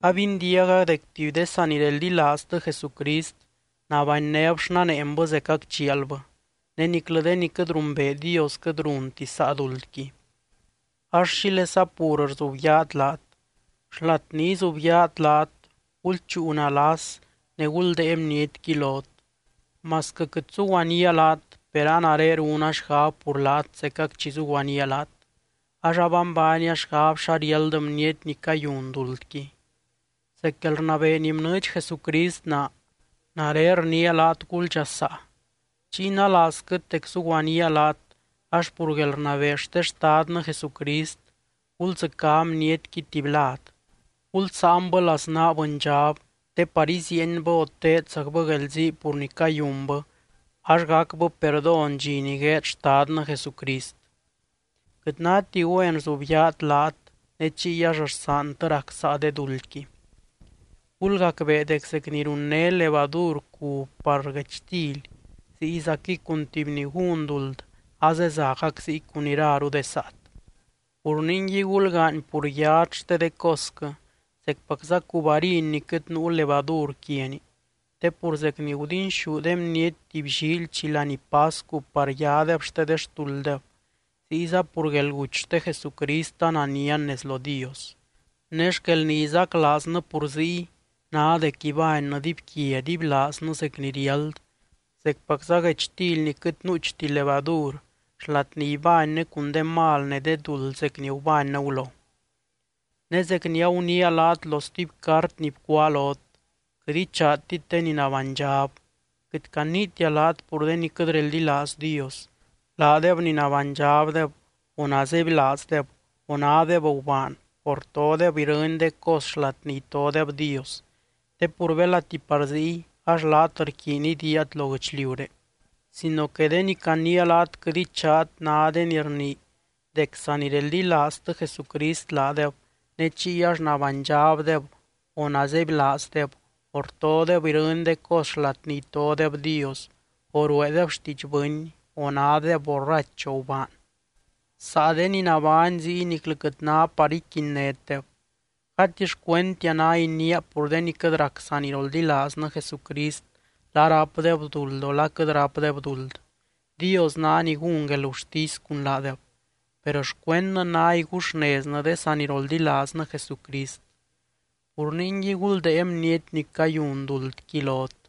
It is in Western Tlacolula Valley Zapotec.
Abindiaga dec tuby de sanireldilaaztɨ Jesucrist nabanynéb xnaneenbɨ zecac chialbɨ, ne niclɨ de ni quɨt rumbee Dios quɨt runti saa duldqui. Ax, ¿xílesa pur rzubyaat laat? Xlat ni izubyaat laat, gulchúu nalas ne guldée bnietqui lot. Masquɨ quɨt zuguaníaa laat, per a nare runa xgab pur laat zecac chi zuguaníaa laat, ax abanbaania xgab xa riáld bniety ni cayun duldqui. Zec guelrnabee ni bnɨɨdx Jesucrist naa, nare rniia laat guldxasaa. Chiy nalaazquɨt dec zuguaníaa laat ax pur guelrnabee xte Xtadnɨ Jesucrist, guldzɨcá bnietqui tuby lad. Gulsáanbɨ laznaa bɨndxab te par iziienbɨ o teedzacbɨ guelzii pur ni cayunbɨ ax gacbɨ perdón dxi ni gueed Xtadnɨ Jesucrist. Quɨt náti güen rzubyaat laat ne chiy ax rsaantɨ rac saa de duldqui. Gulgacbee dec zec ni runné levadur cub par guechtily, ziyzaquɨy cun tuby ni gún duld azezagac ziy cun iraru de saat. Pur ningui, gulgaany pur yat xte de cosquɨ zecpacza cub harin ni quɨt nuu levadur quiani. Te pur zec ni gudinxú de bniety tuby llíily chi laní pascu par yadeb xte de xtulddeb, ziyza pur guelguty xte Jesucrist ananian nez lo Dios. Ne xquel ni izaclaaznɨ pur ziy ná dec ibánnɨ dibyquia dibylaaznɨ zec ni riáld, zecpacza guechtily ni quɨt nuuchti levadur, xlat ni ibánnɨ cun de mal ne de duld zec ni gubánnɨ gulo. Ne zec ni aguniia laat lo stuby cart ni bcuáa lot, quɨt ichaatit de ni nabánydxab. Quɨt caniitia laat pur de ni quɨt reldilaaz Dios, laadeb ni nabánydxabdeb o nazebylaazdeb o nádeb gubaan o rtodeb irɨny de cos xlat ni itodeb Dios, te pur belati par ziy ax laat rquiiny idiiat lo guɨchliuré. Sino que de ni caniia laat quɨt ichaat ná de ni rnii dec sadenireldilaaztɨ Jesucrist laadeb ne chiy ax nabánydxabdeb o nazebylaazdeb o rtodeb irɨny de cos xlat ni itodeb Dios o rueedeb xtiidx bɨny o nádeb borrach o gubaan. Saa de ni nabány ziy niclɨ quɨt ná par iquinnétdeb. Gati xcuendtia ná iniia pur de ni quɨt rac saniroldilaaznɨ Jesucrist la rápdeb duld o la quɨt rápdeb duld, Dios ná ni gún guelgurtisy cun laadeb, per xcuendnɨ ná iguxneznɨ de saniroldilaaznɨ Jesucrist. Pur ningui guldée bniety ni cayun duldqui lot.